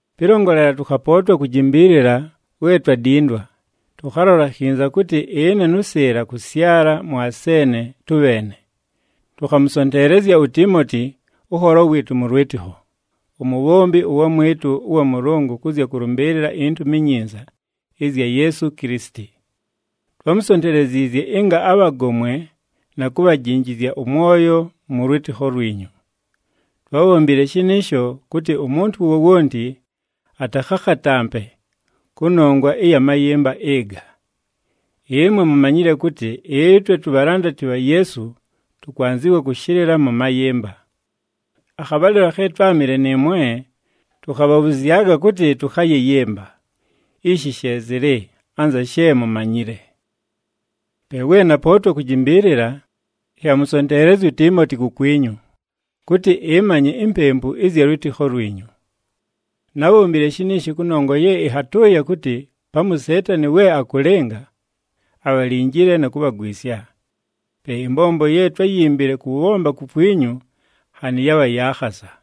Pɨlongolela, tʉkhapootwa kujimbiilila we twadindwa, tʉkhalola khinza kʉtɨ ɨne nʉ Sɨɨla kʉsyala mʉ Aseene tʉbheene. Tʉkhamʉsonteelezya uTiimoti ʉnholo wɨɨtʉ mʉ lwɨtɨkho, umubhombi ʉwamwɨtʉ ʉwa Mʉlʉngʉ kʉ zya kʉlʉmbɨɨlɨla iNtumi iNyinza ɨzya Yeesu Kilisiti. Twámusonteleziizye ɨnga abhagomwe na kubhajinjizya ʉmwoyo mʉ lwɨtɨkho lwinyu. Twábhombile shɨnɨɨsho kʉtɨ umuntu wowonti atakhakhatampe kʉnongwa ɨya mayɨmba ɨga. Ɨmwe mumanyile kʉtɨ ɨtwe tubhalandati bha Yeesu tʉkwanzɨwa kʉshɨlɨla mʉ mayɨmba. Akhabhalɨlo khe twámɨle nɨɨmwe, tʉkhabhabhʉzyaga kʉtɨ tʉkhayɨyɨmba. Ishi she zɨlɨ anza she mumanyile. Pe we napootwa kujimbiilila, ɨnhamʉsonteelezya uTiimoti kukwinyu, kʉtɨ ɨmanye impempu ɨzya lwɨtɨkho lwinyu. Nábhombile shiniishi kʉnongwa ye ɨnhatʉʉya kʉtɨ pamu uSeetani we akʉlɨnga, abhalinjile na kubhagwisya. Pe ɨmbombo ye twáyimbile kʉbhomba kukwinyu nhanɨ yabha ya khasa.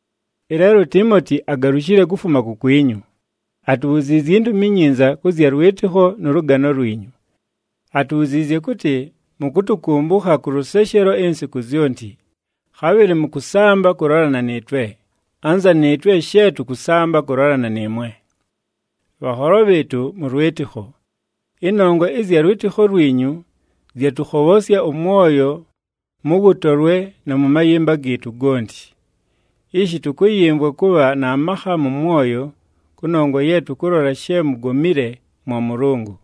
Ɨleelo uTiimoti agalushile kufuma kukwinyu, atubhuziizye intumi inyinza kʉ zya lwɨtɨkho nʉ lʉgano lwinyu. Atubhuziizye kʉtɨ mʉkʉtʉkʉmbʉkha kʉ lʉseshelo insiku zyonti, khabhɨlɨ mʉkʉsamba kʉlolana nɨɨtwe, anza nɨɨtwe she tʉkʉsamba kʉlolana nɨɨmwe. Bhanholo bhɨɨtʉ mʉ lwɨtɨkho, ɨnongwa ɨzya lwɨtɨkho lwinyu zyatʉkhobhosya ʉmwoyo mʉ wʉtolwe na mʉ mayɨmba gɨɨtʉ gonti. Ishi tʉkʉyɨmvwa kʉbha na makha mʉ mwoyo, kʉnongwa ye tʉkʉlola she mugomile mwa Mʉlʉngʉ.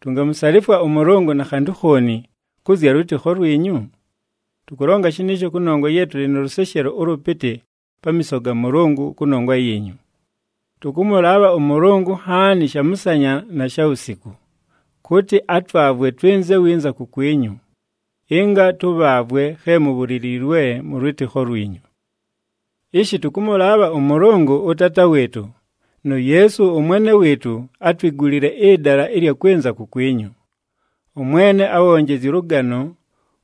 Tungamusalifwa ʉMʉlʉngʉ na khantʉ khooni kʉ zya lwɨtɨkho lwinyu? Tʉkʉlonga shɨnɨɨsho kʉnongwa ye tʉlɨ nʉ lʉseshelo ʉlʉpɨtɨ pamiiso ga Mʉlʉngʉ kʉnongwa yiinyu. Tʉkʉmʉlaabha ʉMʉlʉngʉ nhaani shamʉsanya na shawusiku, kʉtɨ atwavwe twɨnze winza kukwinyu, ɨnga tʉbhaavwe khe mubhuliliilwe mʉ lwɨtɨkho lwinyu. Ishi tʉkʉmʉlaabha ʉMʉlʉngʉ ʉTaata wɨɨtʉ, nu Yeesu ʉMwene wɨɨtʉ atwigulile ɨdala ɨlya kwɨnza kukwinyu. ɄMwene abhonjezye ʉlʉgano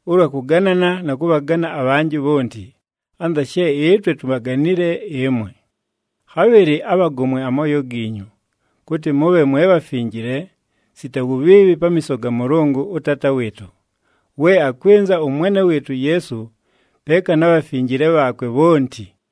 ʉlwa kʉganana na kʉbhagana abhanjɨ bhonti, anza she ɨtwe tubhaganile ɨmwe. Khabhɨlɨ abhagomwe amooyo giinyu, kʉtɨ mʉbhe mwe bhafinjile, sita wubhiibhi pamiiso ga Mʉlʉngʉ ʉTaata wɨɨtʉ, we akwɨnza ʉMwene wɨɨtʉ uYeesu peeka na bhafinjile bhaakwe bhonti.